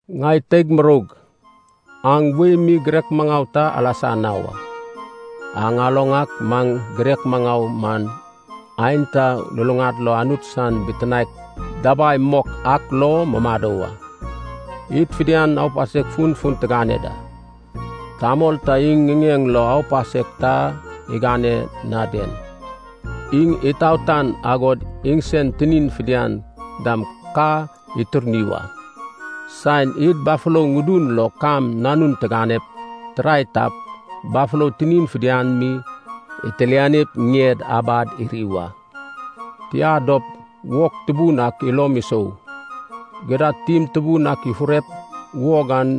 Ŋai teig muroug aŋ wei mi girek maŋau ta alasa na wa. Aŋ aloŋ ak maŋ girek maŋau man aenta luluŋad lo Anut san bitinaek dabai mok ak lo mumado wa. Id fidian aupasek funfun tigane da. Tamol ta iŋ ŋiŋeŋ lo aupasek ta igane na den, iŋ itaotan, agog iŋsen tinin fidian dam ka iturni wa. Saen id bafolo ŋudun lo kam nanun tiganep tirae tap, bafolo tinin fidian mi itilanip ŋied abad iri wa. Tia dop, wog tubun ak ilom isou. Gidad tim tubun ak ifurep wog an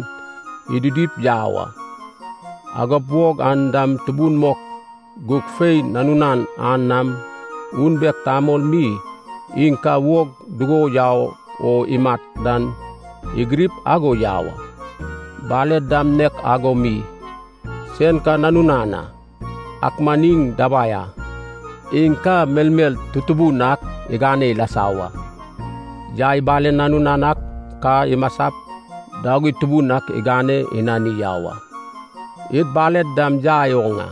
ididip yau a, agod wog an dam tubun mok, gug fei nanunan an nam unbek tamol mi, iŋ ka wog dugo yau o imat dan igirip ago yau a. Baled dam nek ago mi, sen ka nanunan a, ak man iŋ dabai a, iŋ ka melmel tutubun ak igane ilasa wa. Yai balen nanunan ak ka imasap dagui tubun ak igane inani yau a. Id baled dam yai oŋ a,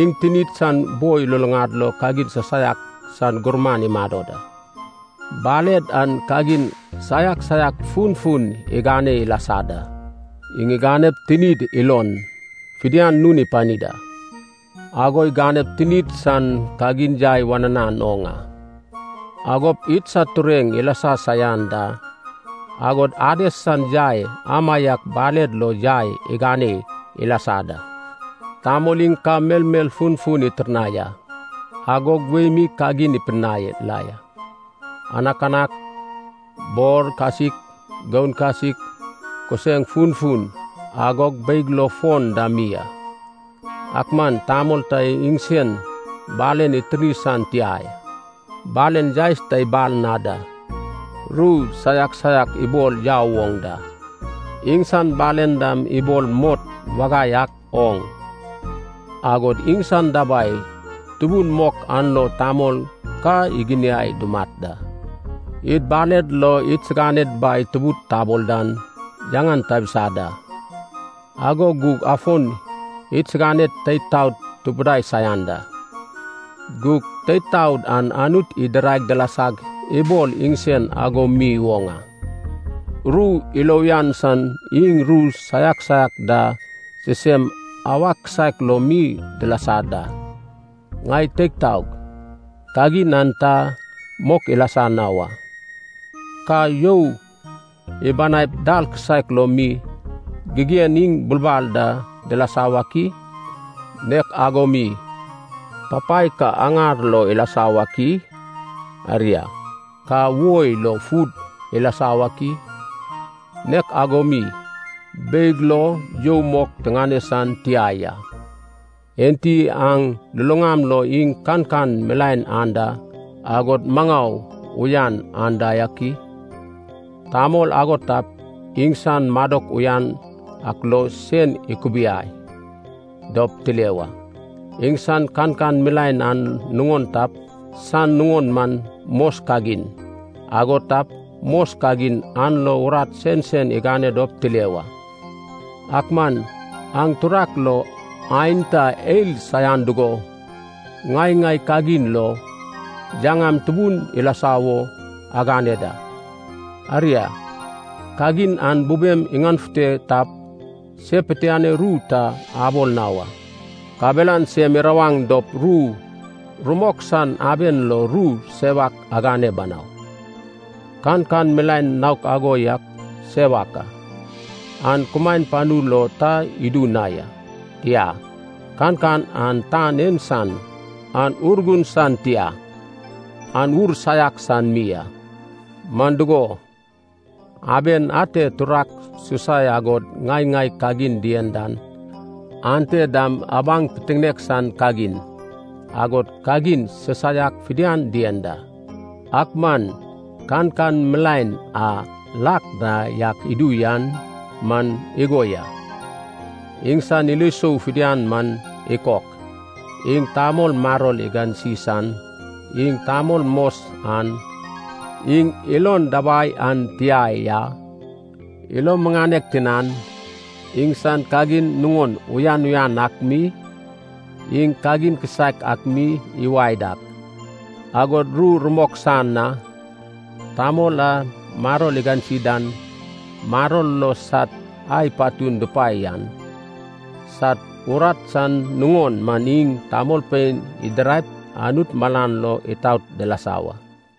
iŋ tinid san boi luluŋad lo kagin sisaiak sad gurman imado da. Baled an kagin saiak saiak funfun igane ilasa da. Iŋ iganep tinid ilon fidian nun ipani da. Ago iganep tinid san kagin yai wananan oŋ a, agop idsad tureŋ ilasa saian da. Agod Ades san yai amaiak baled lo yai igane ilasa da. Tamol iŋ ka melmel funfun itirnai a, agog wei mi kagin ipidinai la ya. Anakanak, bor kasik, goun kasik, kuseŋ funfun agog beig lo fon da mi a. Ak man tamol ta iŋsen balen itirni san tia ya. Balen yaes ta ibal na da, ru saiak saiak ibol yau woŋ da. Iŋsan balen dam ibol mot wagai ak oŋ, agod iŋsan dabai tubun mok an lo tamol ka iginiai dumat a. Id baled lo idsiganed Bai Tubud tabol dan yaŋan tabisa da, ago gug afon idsiganed teid taod tupudai saian da. Gug teid taod an Anut idirai dilasag ibol iŋsen ago mi woŋ a. Ru ilo uyan san iŋ ru saiak saiak da sisem awak kisaek lo mi dilasa da. Ŋai teig taog, kagin an ta mok ilasa na wa. Ka you ibanaip dal kisaek lo mi, gigen iŋ bulbal da dilasa wak i? Nek ago mi papai ka aŋar lo ilasa wak i? Aria, ka woi lo fud ilasa wak i? Nek ago mi beig lo you mok tiŋane san tia ya. Enti aŋ luluŋam lo iŋ kankan milaen anda, agod maŋau uyan anda yak i? Tamol ago tap, iŋsan madok uyan ak lo sen ikubiai dop tile wa. Iŋsan kankan milaen an nuŋon tap, san nuŋon man mos kagin. Ago tap, mos kagin an lo urat sensen igane dop tile wa. Ak man aŋ turak lo aenta eil saian dugo, ŋai-ŋai kagin lo yaŋam tubun ilasa wo agane da. Aria, kagin an bubem iŋanefute tap, se pitianoi ru ta abol na wa. Kabelan sem irawaŋ dop ru rumok san aben lo ru sewak agane banau. Kankan milaen naok ago yan sewak a. An kumaen panu lo ta idu na ya. Tia, kankan an tan en san, an Urgun san tia, an ur saiak san mi a. Man dugo, aben a ate turak susai agod ŋai-ŋai kagin dien dan, ante dam abaŋ pitiŋinek san kagin, agod kagin sisaiak fidian dien da. Ak man kankan milaen a lak na yak idu yan man igo ya: iŋsan ilo isou fidian man ikok, iŋ tamol maror igansi san, iŋ tamol mos an, iŋ ilon dabai an tia ya, ilo muŋanek tinan, iŋsan kagin nuŋon uyan uyan ak mi, iŋ kagin kisaek ak mi iwae dak, agod ru rumok san a. Tamol a maror digansi dan, maror lo sad ai patun dupae yan, sad urat san nuŋon man iŋ tamolpein didiraip Anut malan lo itaot dilasa wa.